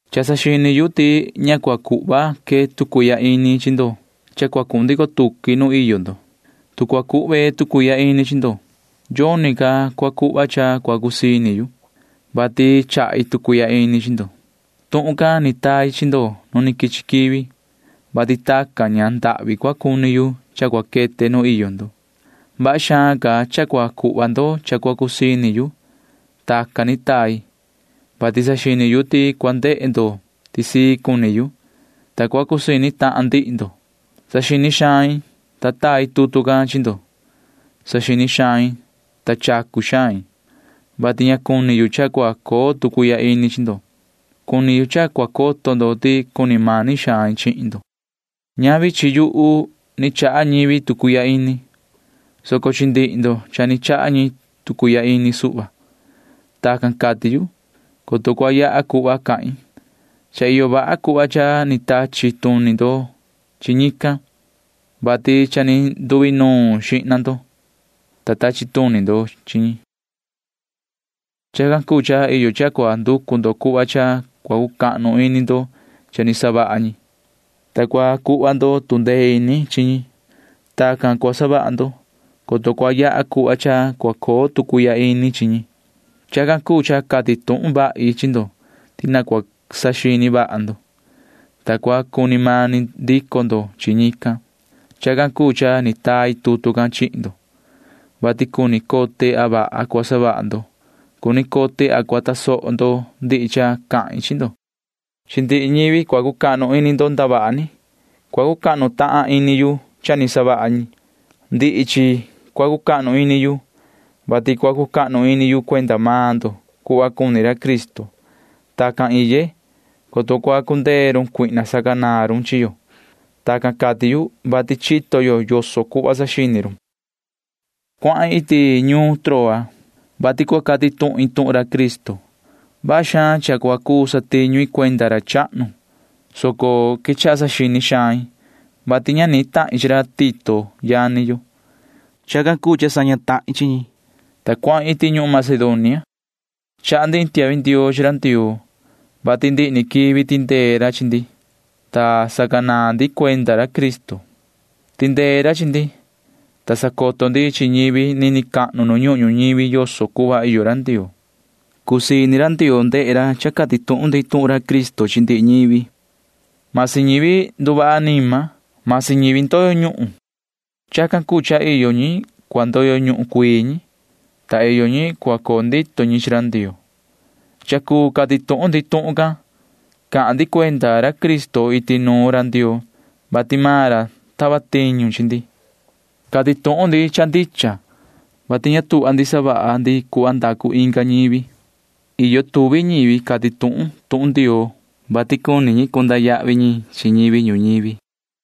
Cha saxini yu ti ña cua cuhva que tu cuihya ini chi ndo cha cua cuhun ndico tuqui nuun iyo ndo. Tu cua cuhve tu cuihya ini chi ndo, yoni ca cua cuhva cha cua cusii ini yu, vati chahi tu cuihya ini chi ndo. Tuhun can ni tai chi ndo nu quichi quivi, vati tacan ña ndahvi cua cuni yu cha cua quete nu iyo ndo. Vaha xaan ca cha cua cuhva ndo cha cua cusii ini yu. Tacan ni tai, vati saxini yu ti cua ndehe ndo ti sii cuni yu, ta cua cusii ini tahan ndihi ndo. Saxini xain, ta tai tutu can chi ndo. Saxini xain, ta chacu xain, vati ña cuni yu cha cua coo tu cuihya ini chi ndo. Cuni yu cha cua coto ndo ti cuni mani xain chihin ndo. Ñavi chi yuhu ni chaha ñivi tu cuihya ini, soco chi ndihi ndo cha ni chaha ñi tu cuihya ini suhva. Tacan cati yu, coto cua yaha cuhva cahin. Cha iyo vaha cuhva cha ni tachi tuni ndo chi ñican, vati cha ni nduinuun xihna ndo, ta tachi tuni ndo chi ñi. Chacan cuu cha iyo cha cua nducu ndo cuhva cha cua cucahnu ini ndo cha ni savaha ñi, ta cua cuhva ndo tu ndee ini chi ñi. Tacan cua savaha ndo, coto cua yaha cuhva cha cua coo tu cuihya ini chi ñi. Chacan cuu cha cati tuhun vahi chi ndo ti na cua saxini vaha ndo, ta cua cuni mani ndico ndo chi ñican. Chacan cuu cha ni tai tutu can chihin ndo, vati cuni cote a vaha cua savaha ndo. Cuni cote a cua tasoho ndo ndihi cha cahin chi ndo. Chi ndihi ñivi cua cucahnu ini ndo ndavaha ni cua cucahnu tahan ini yu cha ni savaha ñi. Ndihi chi cua cucahnu ini yu, vati cua cucahnu ini yu cuenda maan ndo cuhva cuni ra Cristo. Tacan iye, coto cua cundee run Satanaa sacanaan run chi yo. Tacan cati yu, vati chito yo yoso cuhva saxini run. Cuahin iti ñuun Troa, vati cua cati tuhin tuhun Cristo. Vaha xaan cha cua cuu satiñu i cuenda ra chahnu, soco quechaha saxini xain, vati ña ni tahin chi ra Tito yani yo. Chacan cuu cha saña tahin chi ñi, ta cuahin iti ñuhun Macedonia. Chaha ndi iin tiahvi ndioo chi ra Ndioo, vati ndihi ni quivi tindee ra chi ndi, ta sacanaan ndi cuenda ra Cristo. Tindee ra chi ndi, ta sacoto ndi chi ñivi nini cahnu nu ñuhun ñuñivi yoso cuhva iyo ra Ndioo. Cusii ini ra Ndioo ndehe ra cha cati tuhun ndi tuhun Cristo chi ndihi ñivi―masi ñivi nduvaha anima, masi ñivi ndoyo ñuhun. Chacan cuu cha iyo ñi cua ndoyo ñuhun cuii ñi, ta iyo ñi cua coo ndito ñi chi ra Ndioo. Cha cuu cati tuhun ndi tuhun can. Cahan ndi cuenda ra Cristo iti nuun ra Ndioo, vati maan ra tava tiñu chi ndi. Cati tuhun ndi cha ndicha, vati ña tuhva ndi savaha ndi cuhva ndacu inga ñivi. Iyo tuvi ñivi cati tuhun tuhun Ndioo, vati cuni ñi cunda yahvi ñi chi ñivi ñuñivi.